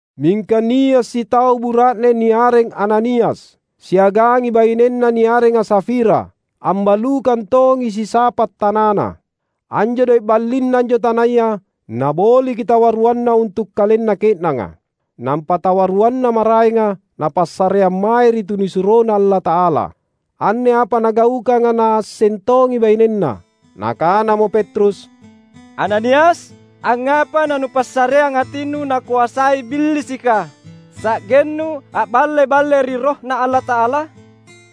Mingka nia’ sitau bura’ne niareng Ananias. Siagangi bainenna niarenga Safira, ambalukang tongi sisapa’ tanana. Anjo doe’ ballinna anjo tanaya, naboliki tawaruanna untu’ kalenna ke’nanga, nampa tawaruanna maraenga napassareang mae ri tunisuroNa Allata’ala. Anne apa nagaukanga naasseng tongi bainenna. Nakanamo Petrus, "Ananias, angngapa nanupassareang atinnu nakoasai Billisika, sa’gennu a’balle-balle ri RohNa Allata’ala?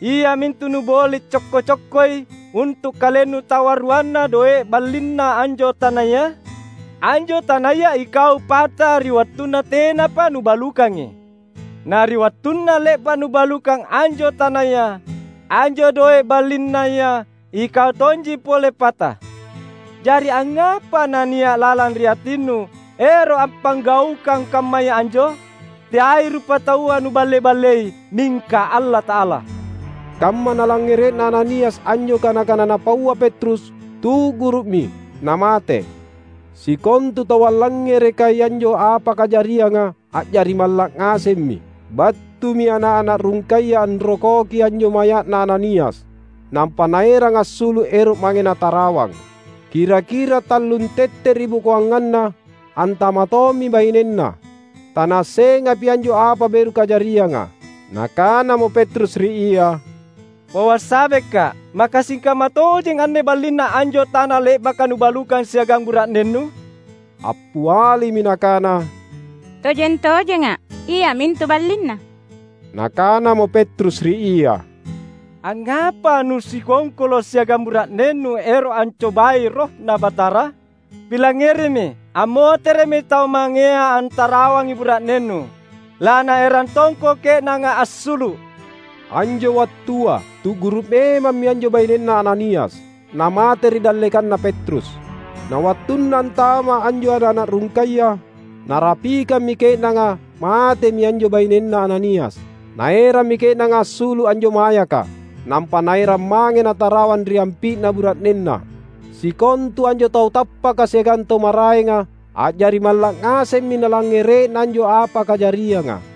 Iamintu nuboli’ cokko-cokkoi untu’ kalennu tawaruanna doe’ ballinna anjo tanaya? Anjo tanaya ikau pata ri wattunna tenapa nubalukangi. Na ri wattunna le’ba’ nubalukang anjo tanaya, anjo doe’ ballinnaya, ikau tonji pole pata. Jari angngapa nania’ lalang ri atinnu ero’ appanggaukang kammaya anjo? Teai rupataua nuballe-ballei, mingka Allata’ala!" Kamma nalangngere’na Ananias anjo kana-kana napaua Petrus, tu’guru’mi, namate. Sikontu tau allangngerekai anjo apa kajarianga, a’jari malla’ ngasemmi. Battumi ana’-ana’ rungkaya anrokoki anjo maya’na Ananias, nampa naerang assulu’ ero’ mange natarawang. Kira-kira tallung tette’ ribokoanganna, antama’ tommi bainenna. Tanaassengapi anjo apa beru kajarianga. Nakanamo Petrus ri ia, "Pauang sabeka’: Maka sikamma tojeng anne ballinna anjo tana le’baka nubalukang siagang bura’nennu?" Appialimi nakana, "Tojeng-tojenga’, iamintu ballinna." Nakanamo Petrus ri ia, "Angngapa nusikongkolo’ siagang bura’nennu ero’ ancobai RohNa Batara? Pilangngerimi! Ammotere’mi tau mangea antarawangi bura’nennu. Lanaerang tongko ke’nanga assulu’." Anjo wattua, tu’guru’ memammi anjo bainenna Ananias, namate ri dallekanna Petrus. Na wattunna antama’ anjo ana’-ana’ rungkaya, narapikammi ke’nanga matemi anjo bainenna Ananias. Naerammi ke’nanga assulu’ anjo mayaka, nampa naerang mange natarawang ri ampi’na bura’nenna. Sikontu anjo tau tappaka siagang tau maraenga, a’jari malla’ ngasemmi nalangngere’na anjo apa kajarianga.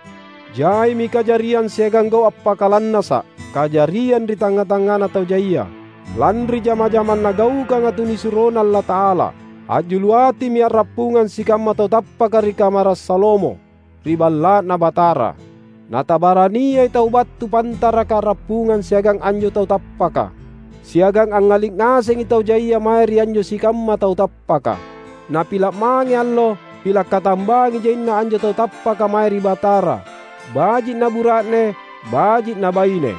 Jaimi kajariang siagang gau’ appakalannasa’ kajariang ri tangnga-tangngana tau jaia, lanri jama-jamang nagaukanga tunisuroNa Allata’ala. A’julu atimi a’rappungang sikamma tau tappaka ri Kamara’ Salomo, ri Balla’Na Batara. Na tabarania tau battu pantaraka a’rappungang siagang anjo tau tappaka. Siagang angngali’ ngasengi tau jaia mae ri anjo sikamma tau tappaka. Napila’ mange allo, pila’ katambangi jaina anjo tau tappaka mae ri Batara — baji’ na bura’ne, baji’ na baine.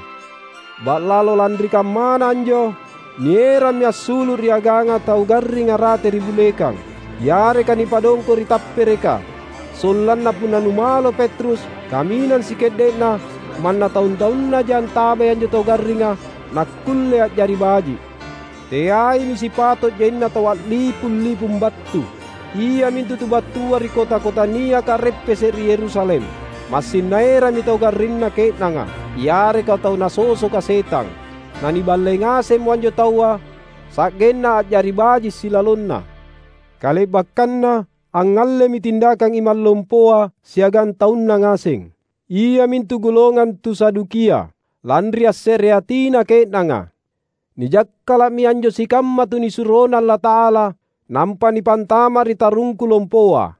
Ba’lalo lanri kammana anjo, nierammi assulu’ ri aganga tau garringa rate ri bulekang, yareka nipadongko’ ri tappereka, sollanna punna numalo Petrus, kaminang sike’de’na manna taung-taunnaja antabai anjo tau garringa, nakkulle a’jari baji’. Teaimi sipato’ jaina tau a’lipung-lipung battu, iamintu tu battua ri kota-kota niaka a’reppese’ ri Yerusalem. Massing naerammi tau garrinna ke’nanga, yareka tau nasosoka setang. Naniballei ngasemmo anjo taua, sa’genna a’jari baji’ silalonna. Kale’bakkanna angngallemi tindakang imang lompoa siagang taunna ngaseng, iamintu golongang tu Sadukia, lanri assereatina ke’nanga. Nijakkala’mi anjo sikamma tunisuroNa Allata’ala nampa nipantama’ ri tarungku lompoa.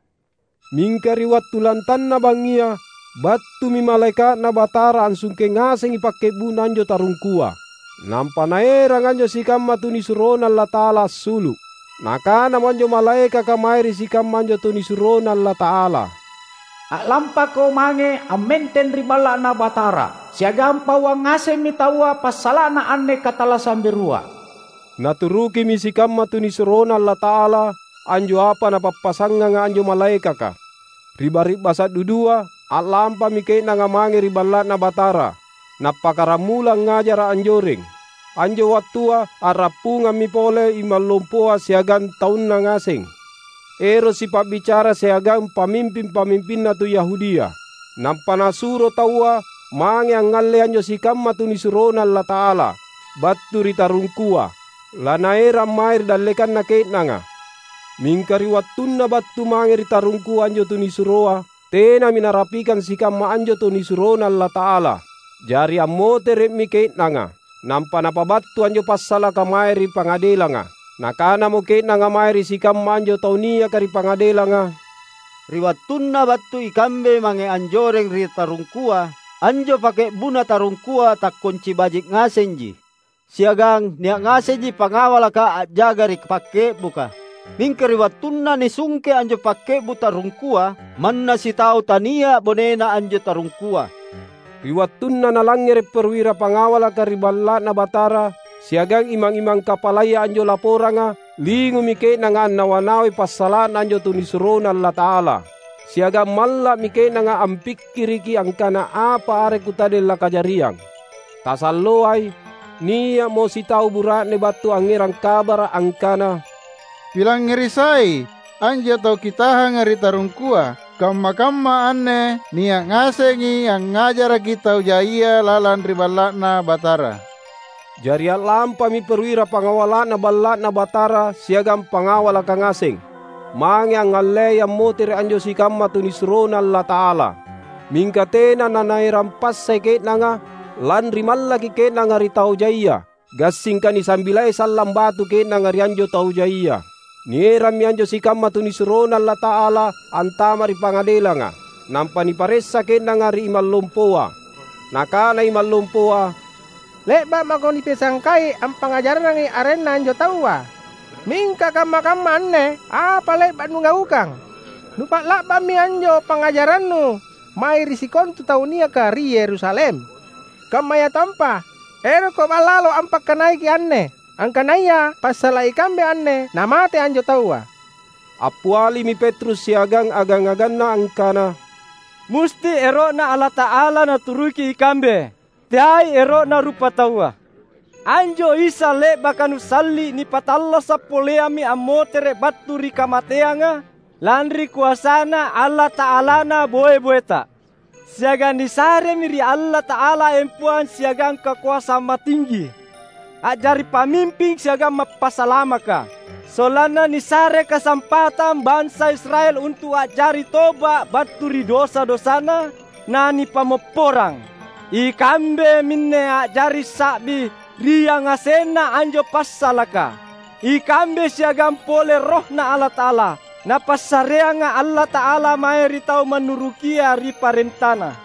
Mingka ri wattu lantanna bangngia, battumi malaeka’Na Batara assungke ngasengi pakke’bu’na anjo tarungkua, nampa naerang anjo sikamma tunisuroNa Allata’ala assulu’. Nakanamo anjo malaekaka mae ri sikamma anjo tunisuroNa Allata’ala. "A’lampako mange ammenteng ri Balla’Na Batara siagang pauang ngasemmi taua passala’na anne katallassang berua." Naturukimi sikamma tunisuroNa Allata’ala anjo apa napappasanganga anjo malaekaka. Ri bari’basa’ dudua, a’lampami ke’nanga mange ri Balla’Na Batara, nappakkaramula angngajara’ anjoreng. Anjo wattua a’rappungammi pole imang lompoa siagang taunna ngaseng, ero’ sipa’bicara siagang pamimping-pamimpinna tu Yahudia. Nampa nasuro taua mange angngallei anjo sikamma tunisuroNa Allata’ala, battu ri tarungkua, lanaerang mae ri dallekanna ke’nanga. Mingka ri wattunna battu mange ri tarungkua anjo tunisuroa, tenami narapikang sikamma anjo tunisuroNa Allata’ala. Jari ammotere’mi ke’nanga, nampa napabattu anjo passalaka mae ri pangadelanga. Nakanamo ke’nanga mae ri sikamma anjo tau niaka ri pangadelanga, "Ri wattunna battu ikambe mange anjoreng ri tarungkua, anjo pakke’bu’na tarungkua takkonci baji’ ngasenji, siagang nia’ ngasenji pangawalaka a’jaga ri pakke’buka. Mingka ri wattunna nisungke anjo pakke’bu’ tarungkua, manna sitau tania’ bonena anjo tarungkua." Ri wattunna nalangngere’ perwira pangawalaka ri Balla’Na Batara siagang imang-imang kapalaya anjo laporanga, lingumi ke’nanga annawa-nawai passala’na anjo tunisuroNa Allata’ala. Siagang malla’mi ke’nanga ampikkiriki angkana apa are kutadeng lakajariang. Tasalloai, nia’mo sitau bura’ne battu angngerang kabara’, angkana, "Pilangngeri sai! Anjo tau kitahanga ri tarungkua, kamma-kamma anne nia’ ngasengi angngajaraki tau jaia lalang ri Balla’Na Batara!" Jari a’lampami perwira pangawala’na Balla’Na Batara siagang pangawalaka ngaseng, mange angngallei ammotere’ anjo sikamma tunisuroNa Allata’ala. Mingka tena nanaerang passai ke’nanga, lanri mallaki ke’nanga ri tau jaia; gassingka nisambilai sallang batu ke’nanga ri anjo tau jaia. Nierammi anjo sikamma tunisuroNa Allata’ala antama’ ri pangadelanga. Nampa niparessa ke’nanga ri imang lompoa. Nakana imang lompoa, "Le’ba’ mako nipisangkai ampangngajarrangi arenNa anjo Taua. Mingka kamma-kamma anne, apa le’ba’ nugaukang! Nupa’la’bammi anjo pangngajarannu mae ri sikontu tau niaka ri Yerusalem. Kammayatompa, erokko ba’lalo ampakkanaiki’ anne, angkanaya passala’ ikambe anne namate anjo Taua." Appialimi Petrus siagang agang-aganna, angkana, "Musti ero’Na Allata’ala naturuki ikambe, teai ero’na rupataua. Anjo Isa, le’baka nusalli’, nipattallasa’ poleammi ammotere’ battu ri kamateanga, lanri koasaNa Allata’alana boe-boeta. Siagang nisaremi ri Allata’ala empoang siagang kakoasang matinggi, a’jari Pamimping siagang Mappasalamaka; sollanna nisare kasampatang bansa Israel untu’ a’jari toba’ battu ri dosa-dosana na nipammopporang. Ikambe minne a’jari sa’bi ri yangasenna anjo passalaka — ikambe siagang pole RohNa Allata’ala, Napassareanga Allata’ala mae ri tau mannurukia ri parentaNa."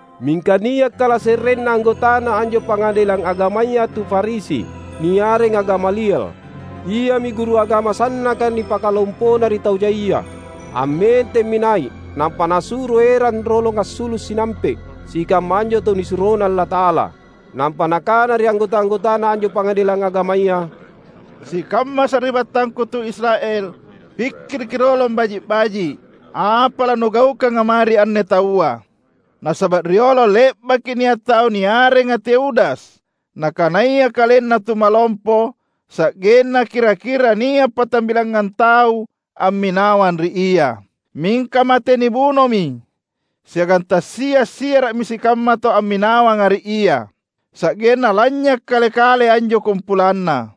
Mingka nia’ kalase’renna anggotana anjo pangadelang agamaya tu Farisi, niarenga Gamaliel. Iami guru agama sannaka nipakalompona ri tau jaia. Ammentemmi nai’, nampa nasuro erang rolong assulu’ sinampe’ sikamma anjo tunisuroNa Allata’ala. Nampa nakana ri anggota-anggotana anjo Pangadelang Agamaya, "Sikamma sari’battangku tu Israel! Pikkiriki rolong baji’-baji’ apa lanugaukanga mae ri anne taua. Nasaba’ riolo le’baki nia’ tau niarenga Teudas, nakanaya kalenna tumalompo, sa’genna kira-kira nia’ patambilangngang tau amminawang ri ia. Mingka mate nibunomi, siagang tassia’-siara’mi sikamma tau amminawanga ri ia, sa’genna lanynya’ kale-kale anjo kumpulanna.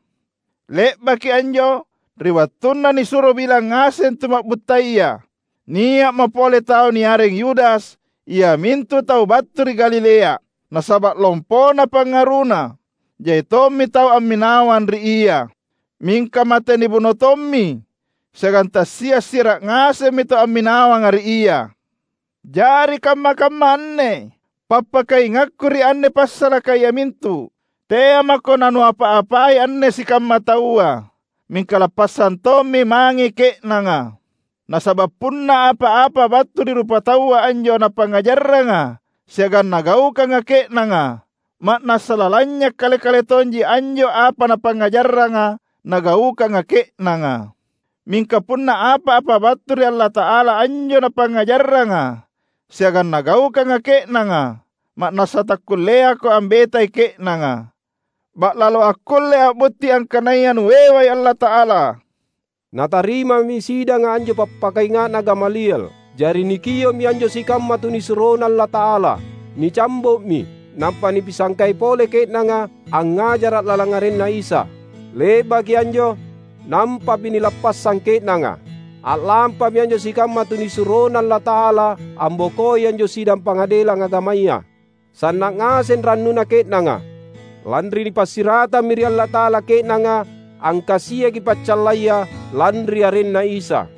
Le’baki anjo, ri wattunna nisuro bilang ngaseng tuma’buttaya, nia’mo pole tau niareng Yudas, iamintu tau battu ri Galilea. Nasaba’ lompona pangaruna, jai tommi tau amminawang ri ia. Mingka mate nibuno tommi, siagang tassia’-siara’ ngasemmi tau amminawanga ri ia. Jari kamma-kamma anne, pappakaingakku ri anne passalaka iamintu: tea’ mako nanuapa-apai anne sikamma taua, mingka lappassang tommi mange ke’nanga. Nasaba’ punna apa-apa battu ri rupataua anjo napangngajarranga siagang nagaukanga ke’nanga, ma’nassa lalanynya’ kale-kale tonji anjo apa napangngajarranga nagaukanga ke’nanga. Mingka punna apa-apa battu ri Allata’ala anjo napangngajarranga siagang nagaukanga ke’nanga, ma’nassa takkulleako ambetai ke’nanga. Ba’lalo akkullei a’butti angkanaya nuewai Allata’ala." Natarimami sidanga anjo pappakainga’na Gamaliel. Jari nikio’mi anjo sikamma tunisuroNa Allata’ala. Nicambo’mi nampa nipisangkai pole ke’nanga angngajara’ lalang arenNa Isa. Le’baki anjo, nampami nilappassang ke’nanga. A’lampami anjo sikamma tunisuroNa Allata’ala ambokoi anjo sidang Pangadelang Agamaya. Sanna’ ngaseng rannuna ke’nanga, lanri nipassiratammi ri Allata’ala ke’nanga angkasiaki paccallaya, lanri arenNa Isa.